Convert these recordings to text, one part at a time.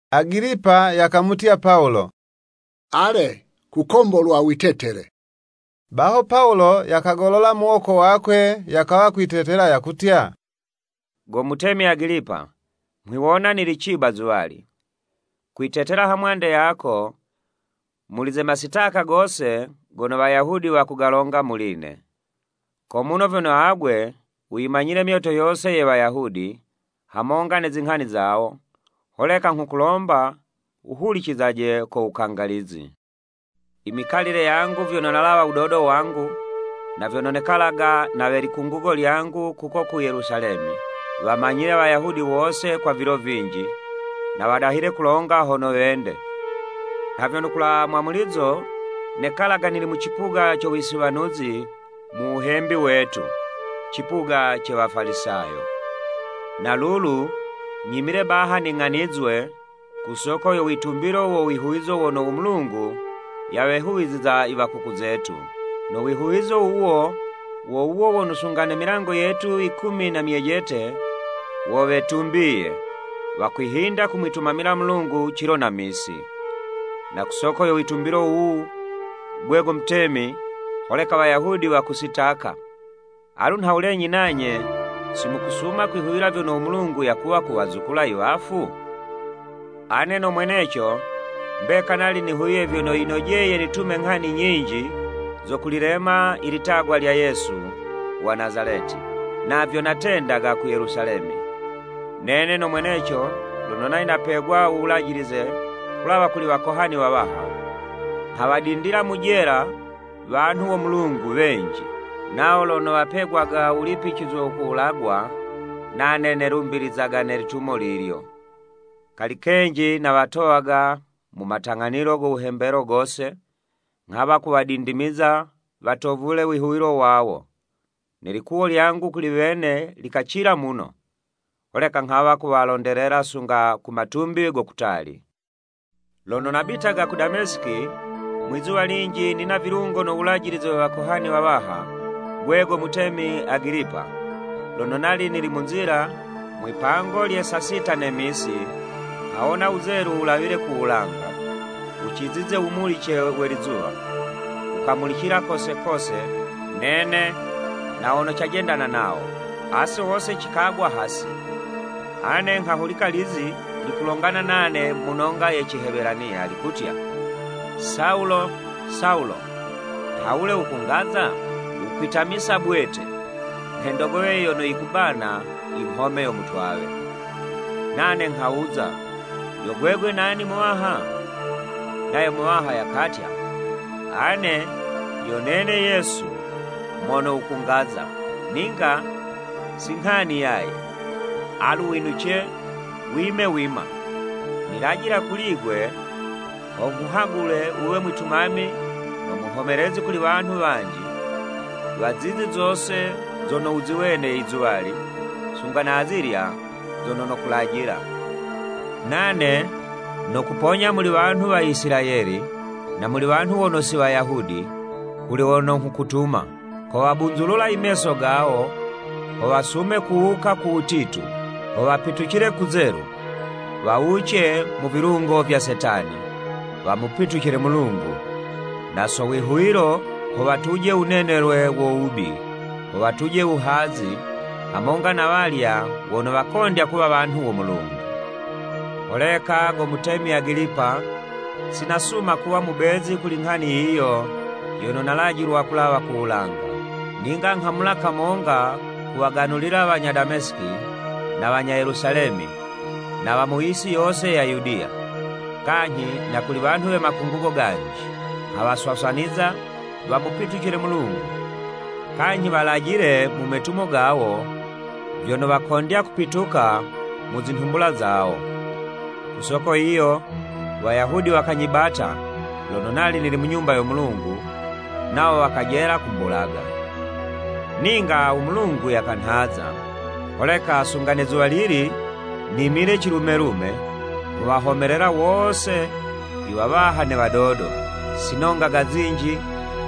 Agilipa yakamutya Pawulo, “Ale, kukombolwa witetele.” Baho Pawulo yakagolola muwoko wakwe, yakawa kwitetela, yakutya, “Go mutemi Agilipa, nghwiwona nili ciba zuwali, kwitetela hamwande yako muli ze masitaka gose gono Wayahudi wakugalonga muli'ne. Ko muno vyono agwe wuyimanyile myoto yose ye Wayahudi, hamonga ne zinghani zawo, holeka nghukulomba wuhulicizaje ko wukangalizi. Imikalile yangu vyono nalawa wudodo wangu, na vyono nekalaga ne we likungugo lyangu kuko ku Yelusalemi. Wamanyile Wayahudi wose kwa vilo vinji, na wadahile kulonga hono wende, nha vyono ku wulawa mwamulizo nekalaga nili mu cipuga co wisiwanuzi mu wuhembi wetu, cipuga ce Wafalisayo. Na lulu nyimile baha ning'anizwe ku soko yo witumbilo wo wihuwizo wono u Mulungu yawehuwiziza i wakuku zetu. No wihuwizo wuwo, wo wuwo wono sunga ne milango yetu yikumi na myejete, wo wetumbiye, wakwihinda kumwitumamila Mulungu cilo na misi. Na ku soko yo witumbilo wuwu, 'gwe go mutemi, holeka Wayahudi wakusitaka! Alu nhawulenyi nanye si mukusuma kwihuwila vyono u Mulungu yakuwa kuwazukula iwafu? Ane no mweneco mbeka nali nihuwiye vyono, yinojeye nitume nghani nyinji zo kulilema ilitagwa lya Yesu wa Nazaleti. Navyo natendaga ku Yelusalemi. Nene no mweneco lono nali napegwa uwulajilize kulawa kuli wakohani wawaha, nghawadindila mu jela wanhu wo Mulungu wenji. Nawo lono wapegwaga wulipicizwe wo kuwulagwa, nane nelumbilizaga ne litumo lilyo. Kali kenji nawatowaga mu matang'anilo go wuhembelo gose, nghawa kuwadindimiza watovule wihuwilo wawo. Ne likuwo lyangu kuli wene likacila muno, holeka nghawa kuwalondelela sunga mu matumbi go kutali. “Lono nabitaga ku Damesiki, mwizuwa linji nina vilungo no wulajilize we wakohani wawaha. Gwe go mutemi Agilipa, lono nali nili mu nzila mwipango lye saa sita ne misi, nghawona wuzelu wulawile ku wulanga, wucizize wumulice we lizuwa, wukamulicila kose kose nene na wono cajendana nawo. Ase wose cikagwa hasi, ane nghahulika lizi likulongana nane mu nonga ye Cihebelaniya likutya, ‘Sawulo, Sawulo, nhawule wukungaza? Wukwitamisa bwete nhe ndogowe yono yikubana inghome yo mutwawe.’ Nane nghawuza, ‘Yo gwegwe nani Muwaha.’ Nayo Muwaha yakatya, ‘Ane yo nene Yesu mono wukungaza. Ninga si nghani yaye, alu winuce, wime wima. Nilajila kuli'gwe ho nghuhagule wuwe mwitumami no muhomelezi kuli wanhu wanji, wa zizi zose zono wuziwene izuwali, sunga na azilya zono nokulajila. Nane nokuponya muli wanhu wa Isilayeli, na muli wanhu wono si Wayahudi, kuli wono nghukutuma. Kowabunzulula i meso gawo, ho wasume kuwuka ku wutitu, ho wapitucile kuzelu, wawuce mu vilungo vya Setani, wamupitucile Mulungu, na so wihuwilo, ho watuje wunenelwe wo wubi, ho watuje wuhazi, hamonga na walya wono wakondya kuwa wanhu wo Mulungu.’ “Holeka, Go mutemi Agilipa, si nasuma kuwa mubezi kuli nghani yiyo yono nalajilwa kulawa ku wulanga. Ninga nghamula kamonga kuwaganulila wanya Damesiki na wanya Yelusalemi na wa mu yisi yose ya Yudiya, kanyhi na kuli wanhu we Makungugo ganji. Nghawaswaswaniza wamupitucile Mulungu, kanyhi walajile mu metumo gawo, vyono wakondya kupituka mu zinhumbula zawo. Ku soko yiyo, Wayahudi wakanyibata lono nali nili mu Nyumba yo Mulungu, nawo wakajela kumbulaga. Ninga u Mulungu yakanhaza, holeka sunga ne zuwalili, nimile cilume-lume, nghuwahomelela wose iwawaha ne wadodo. Sinongaga zinji,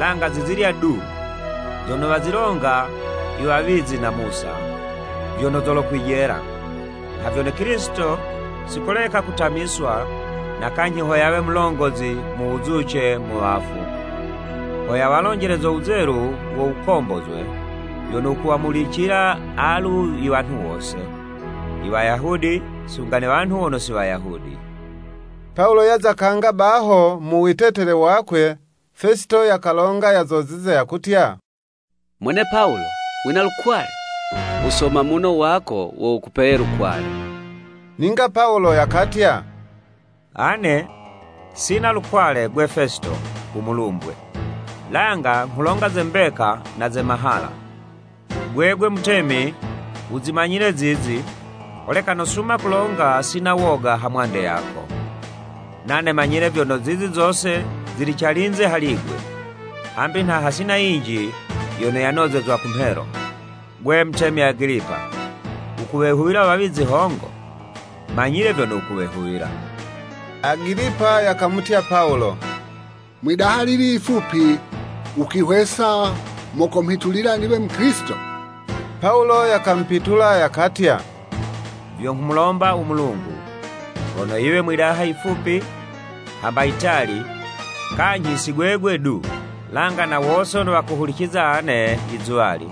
langa zizilya du zono wazilonga iwawizi na Musa, vyono zolokwijela, nha vyono Kilisito si koleka kutamiswa na kanyhi ho yawe mulongozi mu wuzuce mu wafu, ho yawalonjele zo wuzelu wo wukombozwe, vyono wukuwamulicila alu iwanhu wose, Iwayahudi sunga ne wanhu wono si Wayahudi.” Pawulo yaza kanga baho mu witetele wakwe, Fesito yakalonga yazozize yakutya, “Mwene Pawulo! Wina lukwale! Uwusoma muno wako, wo wukupeye lukwale.” Ninga Pawulo yakatya, “Ane sina lukwale, 'gwe Fesito umulumbwe; langa nghulonga ze mbeka na ze mahala. Gwegwe mutemi wuzimanyile zizi, holeka nosuma kulonga sina woga ha mwande yako. Nane manyile vyono, zizi zose zili calinze hali 'gwe, hambi nha hasina yinji yono yanozezwa kumhelo. Gwe mutemi Agilipa, wukuwehuwila wawizi hongo? Manyile vyono wukuwehuwila.” Agilipa yakamutya Pawulo, “Mwi'daha lili yifupi, wukwihwesa mo komhitulila niwe Mukilisito?” Pawulo yakamupitula, yakatya, “Vyo nghumulomba u Mulungu hono yiwe mwi'daha yifupi, hamba yitali, kanyhi si gwegwe du, langa na wose wono wakuhuliciza ane yizuwali,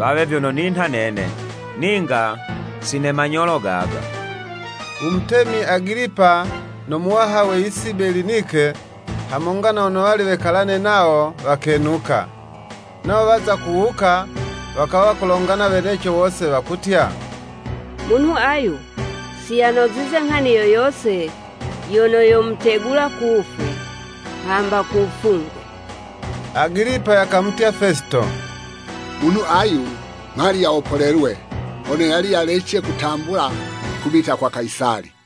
wawe vyono ninha nene, ninga si ne manyolo gaga.” Umutemi Agilipa, no muwaha we yisi Belinike, hamonga na wono wali wekalane nawo, wakenuka. Nawo waza kuwuka, wakawa kulongana weneco wose, wakutya, “Munhu ayu si yanozize nghani yo yose yono yomutegula ku wufwe, hamba ku wufungwe.” Agilipa yakamutya Fesito, “Munhu ayu mhali yawopolelwe, hono yali yalece kutambula kubita kwa Kayisali.”